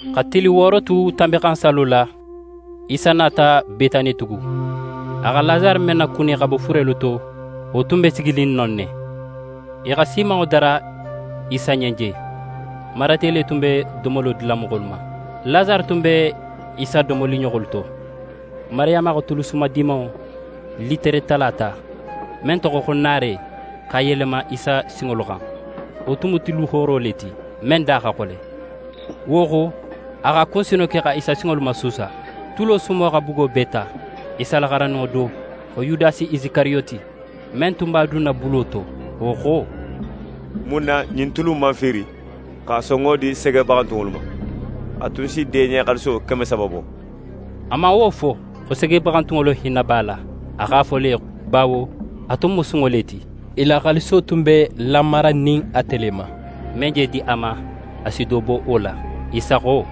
Xa tili wooro tu Tanbinxansallo la, Isa nata Betani tugun. A xa Lasare men nakuni xa bo furelu to, wo tun be siginin non ne. I xa siimanŋo dara Isa ɲen je. Marate le tun be domolo dila moxolu ma. Lasare tun be Isa domoliɲoxolu to. Mariyama xa tulu sumadimanŋo litere tala ta, men toxo xo nare, x'a yelema Isa sinŋolu xan. Wo tun mu tulu hooro le ti, men da xa xole. Wo xo, a x'a kunsino ke xa Isa sinŋolu masuusa. Tulo sumo xa bugo bee ta. Isa la xarandinŋo do, xo Yudasi Isikariyoti, men tun b'a dunna bulo to, wo xo: «Mun na ɲin tulu in man fiiri, x'a sonŋo di segebaxantunŋolu ma? A tun si deɲe xaaliso keme saba bo.» A man wo fo, xo segebaxantunŋolu hinna b'a la. A x'a fo le, bawo a tun mu sunŋo le ti. I la xaaliso tun be lamaranin ate le ma. Men je di a ma, a si do bo wo la. Isa xo: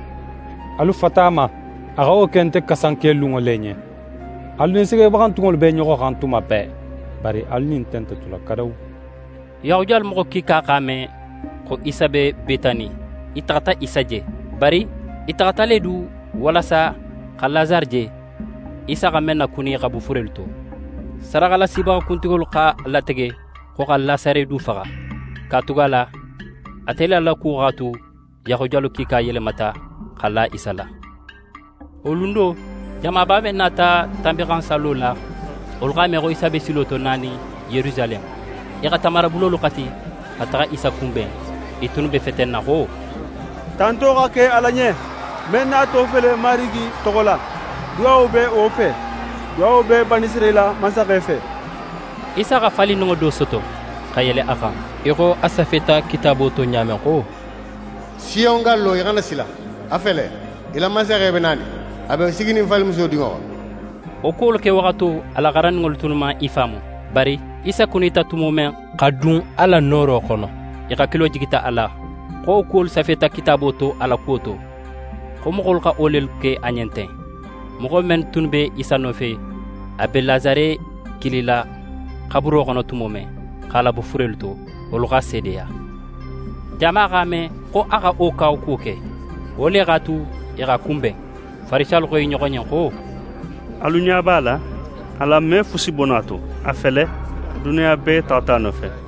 «Alu fata a ma. A xa wo ke nte kasankelunŋo le ɲen. Alu nin segebaxantunŋolu be i ɲoxo xan tuma bee. Bari alu nin nte nte tula kadawu.» Yahudiyalu moxo kiika x'a me, xo Isa be Betani. I taxata Isa je. Bari i taxata le du, walasa xa Lasare je, Isa xa men nakuni xa bo furelu to. Sadaxalasibaxa kuntigolu x'a latege, xo xa Lasare du faxa. Katugala ate le la kuwo x'a tu Yahudiyalu kiika yelemata, xa la Isa la. Wo lun do, jamaba men nata Tanbinxansallo la, wolu x'a me xo Isa be silo to, nanin Yerusaleme. I xa tamarabulolu xati, xa taxa Isa kunben. I tunnu be fetenna xo: «Tanto xa ke Ala ɲen! Men nato fele Marigi toxo la, duwawo be wo fe! Duwawo be Banisirayila mansaxe fe!» Isa xa falindinŋo do soto, xa yele a xan, í xo a safeta Kitaabo to ɲa men xo: «Siyon gallo, í xana sila: A fele, í la mansaxe be nanin, a be siginin falimuso dinŋo xan.» Wo kuwolu kewaxato, a la xarandinŋolu tunnu man i faamu. Bari Isa kunita tumo men, xa dun a la nooro xono, i hakilo jigita a la, xo wo kuwolu safeta Kitaabo to a la kuwo to, xo moxolu xa wo lelu ke a ɲen ten. Moxo men tunnu be Isa nofe, a be Lasare kilila xaburo xono tumo men, x'a labo furelu to, wolu x'a seedeya. Jama x'a me, xo a xa wo kawakuwo ke. Wo le x'a tu, i x'a kunben. Farisiyalu xo i ɲoxo ɲen xo: «Alu ɲa b'a la, alan me fusi bo no a to. A fele, duniya bee taxata a nofe.»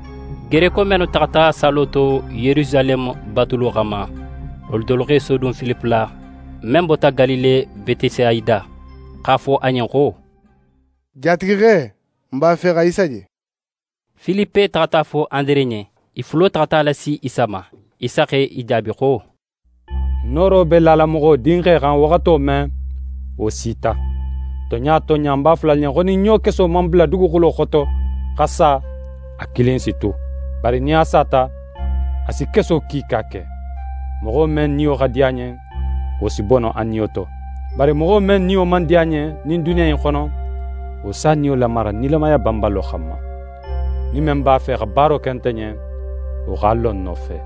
Gereko mennu taxata sallo to Yerusaleme batulo xanma, wolu dolu x'e sodun Filipe la, men bota Galile Betesayida, x'a fo a ɲen xo: «Jatigixe, n b'a fe xa Isa je.» Filipe taxata a fo Andere ɲen, i fulo taxata a lasi Isa ma. Isa x'e jaabi xo: «Nooro be lala Moxo Dinxe xan waxato men, wo sita. Tonɲa tonɲa, ń b'a fola alu ɲen xo, nin ɲokeso man bula duguxulo xoto, xa sa, a kilin si tu. Bari nin a sata, a si keso kiika ke. Moxo men niyo xa di a ɲen, wo si bono a niyo to. Bari moxo men niyo man di a ɲen ɲin duniya in xono, wo s'a niyo lamara nilamaya banbalo xanma. Nin men b'a fe xa baaro ke nte ɲen, wo x'a lo ń nofe.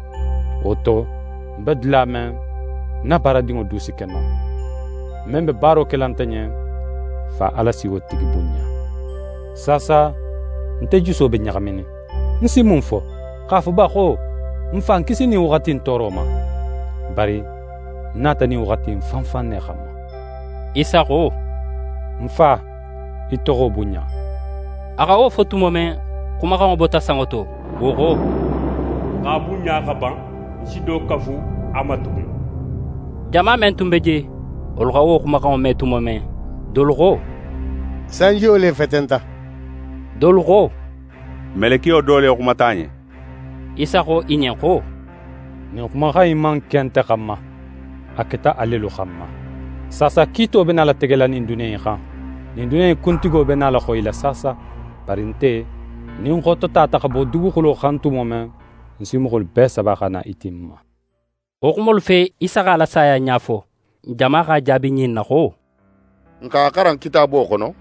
Wo to, ń be dula men, ń na baaradinŋo du si ke non. Men be baaro kela nte ɲen, Fa Ala si wo tigi bunɲa. «Saasa nte juso be ɲaxaminin. Ń si mun fo? X'a fo ba xo: “Ń Fa, ń kisi ɲin waxati in tooro ma?” Bari ń nata ɲin waxati in fan fan ne xanma.» Isa xo: «Ń Fa, í toxo bunɲa!» A xa wo fo tumo men, xumaxanŋo bota sanŋo to, wo xo: «Ń x'a bunɲa xa ban. Ń si do kafu a ma tugun.» Jama men tun be je, wolu xa wo xumaxanŋo me tumo men, dolu xo: «Sanjiyo le fetenta.» Dolu xo: «Melekiyo do le xumata a ɲen.» Isa xo i ɲen xo: «Ɲin xumaxan in man ke nte xanma. A keta a lelu xanma. Saasa kiito be nala tegela ɲin duniya in xan. Ɲin duniya in kuntigo be nala xoyila saasa. Bari nte, nin ń xototata xa bo duguxulo xan tumo men, ń si moxolu bee saba xa na i ti ń ma.» Wo xumolu fe, Isa x'a la saya ɲa fo. Jama x'a jaabi ɲin na xo: «N x'a xaran Kitaabo xono,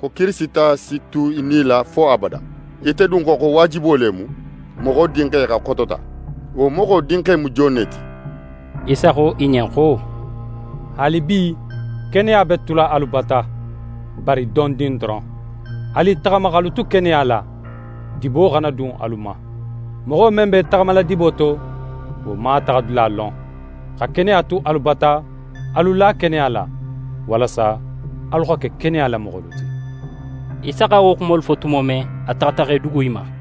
xo Kirisita si tu í nila fo abada. Ite dun xo, xo waajibo le mu Moxo Dinxe xa xotota? Wo Moxo Dinxe mu jon ne ti?» Isa xo i ɲen xo: «Haalibi, keneya be tula alu bata, bari dondin doron. Alu i taxama x'alu tu keneya la, dibo xana dun alu ma. Moxo men be í taxamala dibo to, wo man a taxadula lon. Xa keneya tu alu bata, alu la keneya la, walasa alu xa ke keneya la moxolu ti.» Isa xa wo xumolu fo i ɲen tumo men, a taxata, x'é dugu i ma.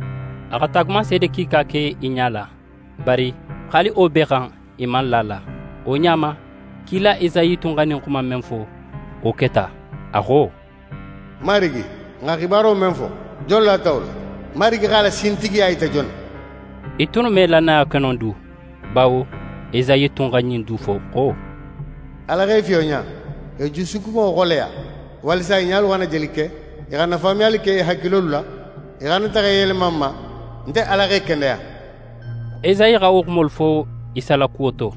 A xa taagumanseede kiika ke i ɲala, bari haali wo bee xan, i man la a la. Wo ɲa ma, kila Esayi tun xa ɲin xuma in men fo, wo keta. A xo: «Marigi, n xa xibaro men fo, jon lata wo la? Marigi x'a la sintigiya yita jon na?» I tunnu me lannaya ke no du, bawo Esayi tun xa ɲin du fo xo: «Ala x'e fiyonɲa, x'e jusukunŋo xoleya; walasa i ɲalu xana jeli ke, i xana faamuyali ke i hakilolu la, i xana taxa i yelema ń ma, nte Ala x'e kendeya.» Esayi xa wo xumolu fo Isa la kuwo to,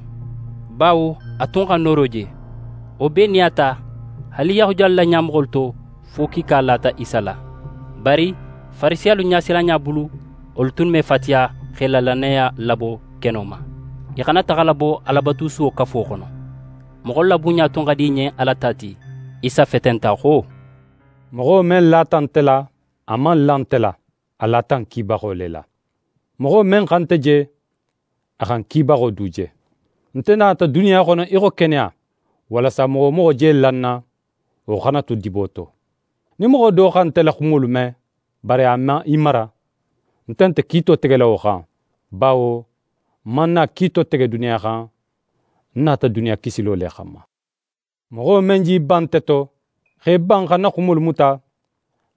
bawo a tun x'a nooro je. Wo bee nin a ta, haali Yahudiyalu la ɲamoxolu to, fo kiika lata Isa la. Bari Farisiyalu ɲasilanɲa bulu, wolu tunnu me fatiya, x'e la lannaya labo keno ma, i xana taxa labo Alabatusuwo kafo xono. Moxolu la bunɲa tun xa di i ɲen Ala ta ti. Isa fetenta xo: «Moxo men lata nte la, a man la nte la, a lata ń kibaxo le la. Moxo men xa nte je, a xa ń kibaxo du je. Nte nata duniya xono í xo keneya, walasa moxo wo moxo je la ń na, wo xana tu dibo to. Nin moxo do xa nte la xumolu me, bari a man i mara, nte nte kiito tegela wo xan, bawo ń man na kiito tege duniya xan, ń nata duniya kisilo le xanma. Moxo men j'í ban nte to, x'é ban xa ń na xumolu muta,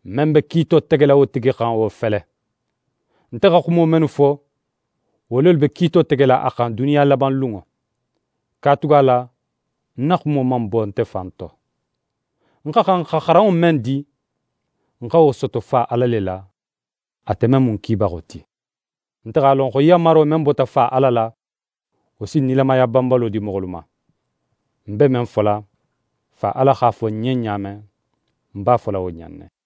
men be kiito tegela wo tigi xan, wo fele: Nte xa xumo mennu fo, wo lelu be kiito tegela a xan duniya labanlunŋo. Katugala ń na xumo man bo nte fan to. Ń xa xan xa xaranŋo men di, ń xa wo soto Fa Ala le la, ate men mu ń kibaxo ti. Nte x'a lon xo yanmaro men bota Fa Ala la, wo si nilamaya banbalo di moxolu ma. Ń be men fola, Fa Ala x'a fo ń ɲen ɲa men, ń b'a fola wo ɲa in ne.»